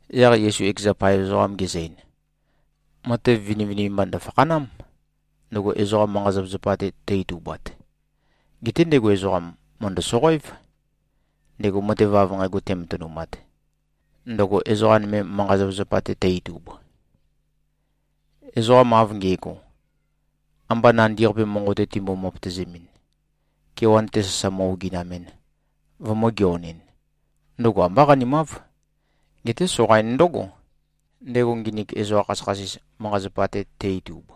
Yaq Yesu ekeza paev ezoqam gezø-ein, “Matev vinivinimba ndø̀fakhanám, ndøgo ezoqa manqa-zapazapa-te tø-itubat. Geté ndego ezoqam, mø̀ndø-soqoév, ndego matev av nqægo tematønumat, ndøgo ezoqa nøme manqa-zapazapa-te tø-itub. Ezoqa av nge꞉go, amba nandi-qape monqo-te timbo-møpøtøzemɨn, kewan-te sasa mø-oginamɨn, vømø̄-geonɨn, ndøgo ambá qanimáv. Geté soqain ndǿgo, ndego nginik ezoqa khasøkhasis manqa-zapa-te te-itub.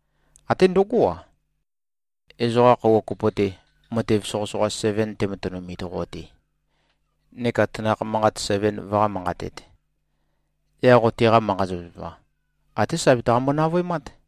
Até ndøgó-a, ezoqa khøuwa kopo-te, matev soqøsoqa seven tematønumit qo-te, neka tanakh manqat seven vøqá-manqatēt, yaq qo teqa manqa-zapazapa, até sa betaqambo-navøemát.”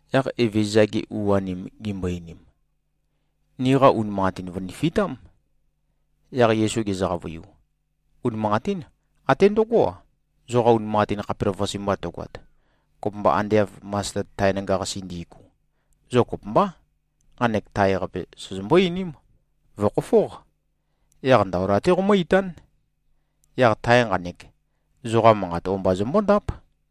Yaq Evezøza-gi u-anim gimbo-einim, “Niqa unimanqatin vø̀nifitám.” Yaq Yesu gezø-qavøiu, “Unimanqatín. Até ndøgó-a, zoqa unimanqatin khapelavøqase mba tøgoat, kopømba ande av masted tae nanga-qasi ndi꞉gu, zo kopømbá, nqanek tae-qape sozombó-einím, ‘Vø̀khofóq. Yaq ndaola-té qoqomǿ-itán.’ Yaq tae nqanek, zoqa manqat o-mba zømbóndáp.”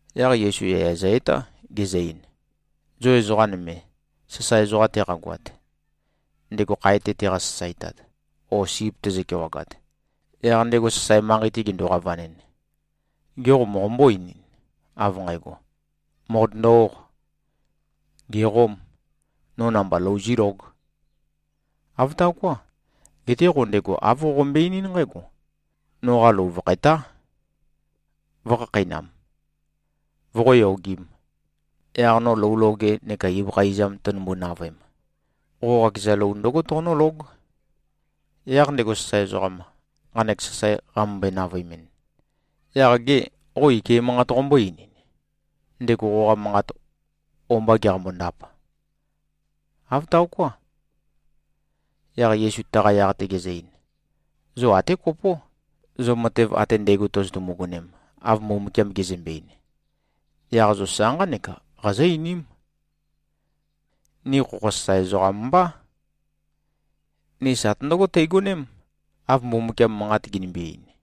Yaq Yesu yaya zø-etá, gezø-ein, “Zo ezoqa nøme, sasae ezoqa teqagoat, ndego khae-te teqa-sasaetat o sip tezø-kewagat, yaq ndego sasae manqei-te gendo-qavanɨn, gê, qo moqombó-einin, av nqægo, ‘Mòqotøndo-óq. Gèqóm. No namba lou zílóg’? Āv taoká. Geté qo ndego āv qoqombøe-einín nqǽgo, ‘Noqa lou vø̀khætá, vø̄khakheinam, voqó-yogīm. Yaq no lou loge neka ibøkha izam tønømbu-navøem, qo qakeza lou ndǿgo toqonǿlóg.’ Yaq ndego sasae ezoqam, nqanek sasae qamømbøe-navøemɨn, yaq gê, qo ike manqat qombó-einin, ndego qoqa manqat o-mba geqambo-ndap? Āv taoká.” Yaq Yesu taqa yaq-te gezø-ein, “Zo até kopó. Zo matev ate ndægo tozotumu-gonem, av Mbumbukiam gezømbe-ein, yaq zo sa nqánek qazó-einím, ‘Ni khokho sasae ezoqam mbá. Ni satø ndǿgo teigoném, av Mbumbukiam manqat ginimbi-ein.’”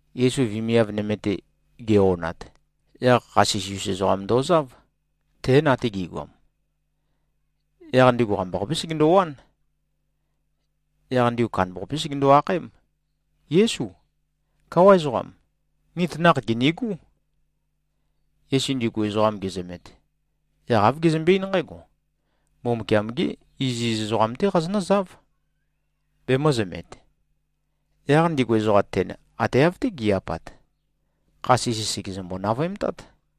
Yesu vemiav nøme-te ge-onat, yaq kha sisi-us ezoqam ndozáv. Tén ate gi꞉goam. Yaq ndigu qambaqapé segendowán. Yaq ndigu kandambaqape segendo-akhaém, “Yésu. Káwa ezoqam. Ni tanakh gìnigú.” Yesu ndigu ezoqam gezømet, yaq āv gezømbe-eín nqǽgo, “Mbumbukiam-gí iziz ezoqam-té qazonǿzáv, bemø̄zømet.” Yaq ndigu ezoqam ten ate av-té gi꞉-apat, kha sisi sègezømbo-navøemtát.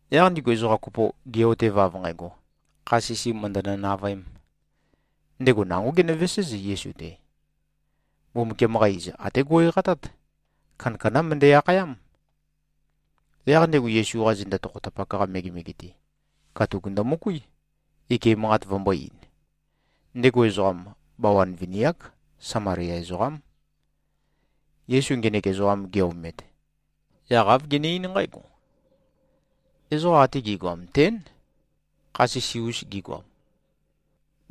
Yaq ndigu ezoqa kopo ge꞉-otev av nqægo, kha sisi mø̀ndønø-navøēm, ndego nangó genøveséz, Yesu-te. Mbumbukiam-qa iz, até go꞉-eqatát. Kandakandá møndæ-akhayám. Yaq ndego Yesu-qa zenda tokhotapak-qa megemege-te, katuk ndømøkuí, ike manqat vømbō-ein. Ndego ezoqam, bawan vini-ák. Samalia ezoqám. Yesu ngenek ezoqam ge-omet, yaq āv gene-eín nqǽgo, “Ezoqa ate gi꞉goam tén, kha sisi-us gigoam,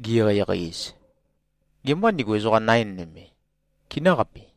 gi-eqeieqei-ez. Gemâ ndigu ezoqa nain nøme, kinǿqapi?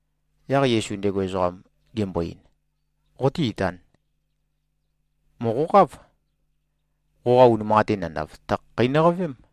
Yaq Yesu ndego ezoqam gembo-ein, “Qoté-itān. Mòqoqáv. Qoqa unimanqatin nandav, tø̀khakheinøqavém.”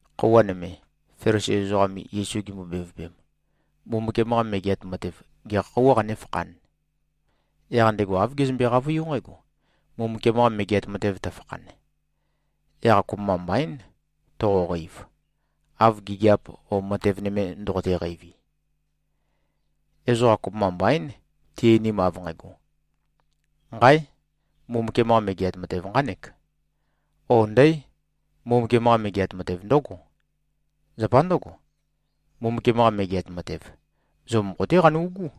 Khøuwa nøme, Felisi ezoqam Yesu gimbo-bevøpem, Mbumbukiam-qa Megeat Matev gekha khøuwā qanéfakhān, yaq ndego āv gezømbe-qavøiú nqǽgo, “Mbumbukiam-qa Megeat Matev tøfakhan, yaq kopømba mbaín, toqoqeiv, av gigiap o matev nøme ndoqote-qeivi. Ezoqa kopømba mbaín, ti-einim av nqægo, ‘Nqáe! Mbumbukiam-qa Megeat Matev nqánek,’ ó, ‘Ndǽ! Mbumbukiam-qa Megeat Matev ndǿgo.’ Zapa ndǿgo, Mbumbukiam-qa Megeat Matev, zo mokho-té qanu꞉gú.”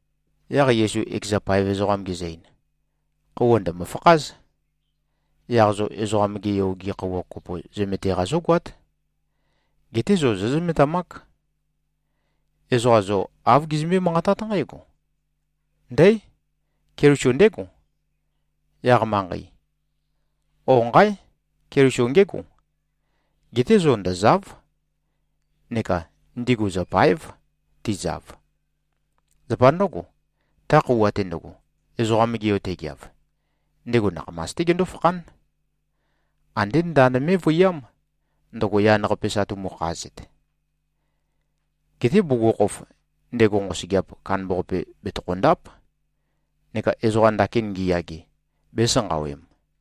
Yaq Yesu ekeza paev ezoqam gezø-ein, “Khøuwa ndø̀mø-fakház. Yaq zo Ezoqam-gé Yo-gi khøuwa kopo zømete-qa zógoát. Geté zo zózømetamák. Ezoqa zo āv gizømbé-manqatát nqǽgo, ‘Ndǽ! Keliso ndégo, yaq manqei,’ ó, ‘Nqáe! Keliso ngégo.’ Geté zo ndø̀za᷄v, neka ndigu zø̀pa᷄ev, tizav. Zapa ndǿgo, ta khøuwa-te ndøgo, Ezoqam-ge Yo tegeav, ndego nakhamas-té gendó-fakhán. Andé ndand mé꞉vøiyám, ndøgo yan-qape sa tumukhazet. Geté bugukhokhof, ndego nqosøgeap kandambaqape bètøkho-ndáp neka ezoqa ndakin ngiyage, bēsanqawem.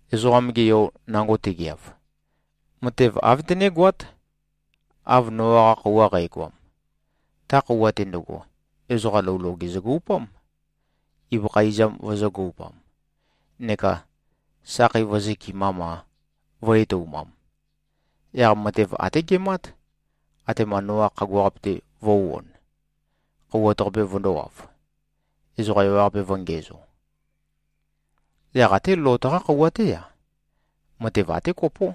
Ezoqam-ge Yo nango tegeav, matev āv tønégoát, av Noa-qa khøuwa qægoam. Ta khøuwa-te ndøgo, ezoqa lou loge zøgoupám, ibøkha izam vøzø̄-goupam, neka sakhei vø̄zøkɨmam-a, vø̄-etoumam. Yaq matev até gemát, atema Noa khagua-qape-te vø̄u-on, khouwat-qape vøndōwav, ezoqa ewaqape vø̄ngiæzo. Yaq até Lot-qá khøuwa-té-a, matev até kopó,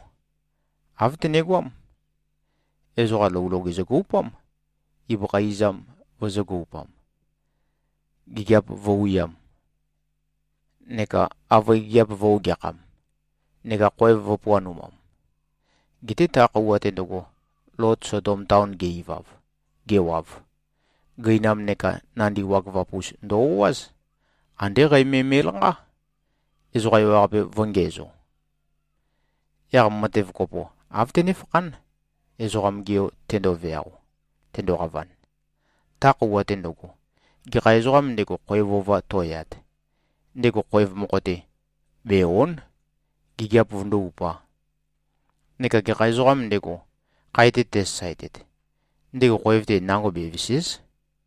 āv tønegoám. Ezoqa lou loge zøgoupám, ibøkha izam vø̄zø-goupam, gigiap vø̄wiam, neka avøe gigiap vø̄-ogeakham, neka khoev vø̄puanemam. Geté ta khøuwa-te ndøgo, Lot Sodom taon ge꞉-ivav, gewav, gøinam neka nandi wagøvap-us ndø-o꞉áz. Andé qæ me me꞉lanqá, ezoqa ewaqape vø̄ngiæzo. Yaq matev kopo, āv tønéfakhán, Ezoqam-ge Yo tendoveao, tendoqavan. Ta khøuwa-te ndøgo, gekha ezoqām ndego, khoev ova to꞉yat, ndego khoev mokho-te bè-o᷄n, gigiap vømøndó-upā. Neka gekha ezoqām ndego, khae-te tesasaetet, ndego khoev-te nango bevèse᷄z.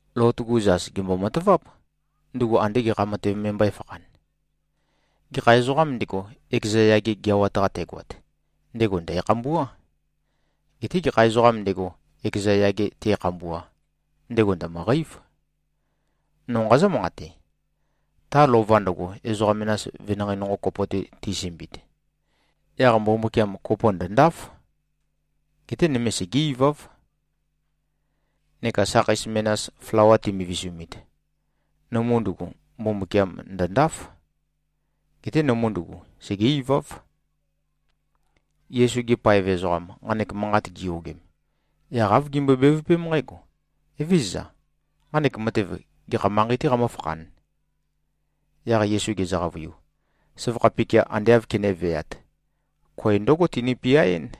Lot-gu zas gèmbo-mataváp, ndugu andē gekha matev me mbø̄efakhan. Gekha ezoqām ndego, ekeza yage geawat-qa tegoat, ndego ndæ̀khambuá. Geté gekha ezoqām ndego, ekeza yage te꞉khambua, ndego ndø̀møqeív. No nqazǿ-manqate: Ta lova ndøgo, ezoqa menas venanqei nonqo kopo-te tisømbiit, yaq Mbumbukiam kopo ndø̀ndáf. Geté nøme, segé-iváv. Neka sakhei menas, flawa timivisumit, nømu ndugu, Mbumbukiam ndø̀ndáf. Geté nømu ndugu, segé-iváv.” Yesu-gi paev ezoqam, nqanek manqat giyogem, yaq āv gimbøe-bevøpém nqǽgo, “Evézøza. Nqanek matev, gekha manqei-té qamǿfakhān?” Yaq Yesu gezø-qavøiu, “Søvakha pikia ande āv kenéveāt, koe ndǿgo tinø-piaɨ́n.”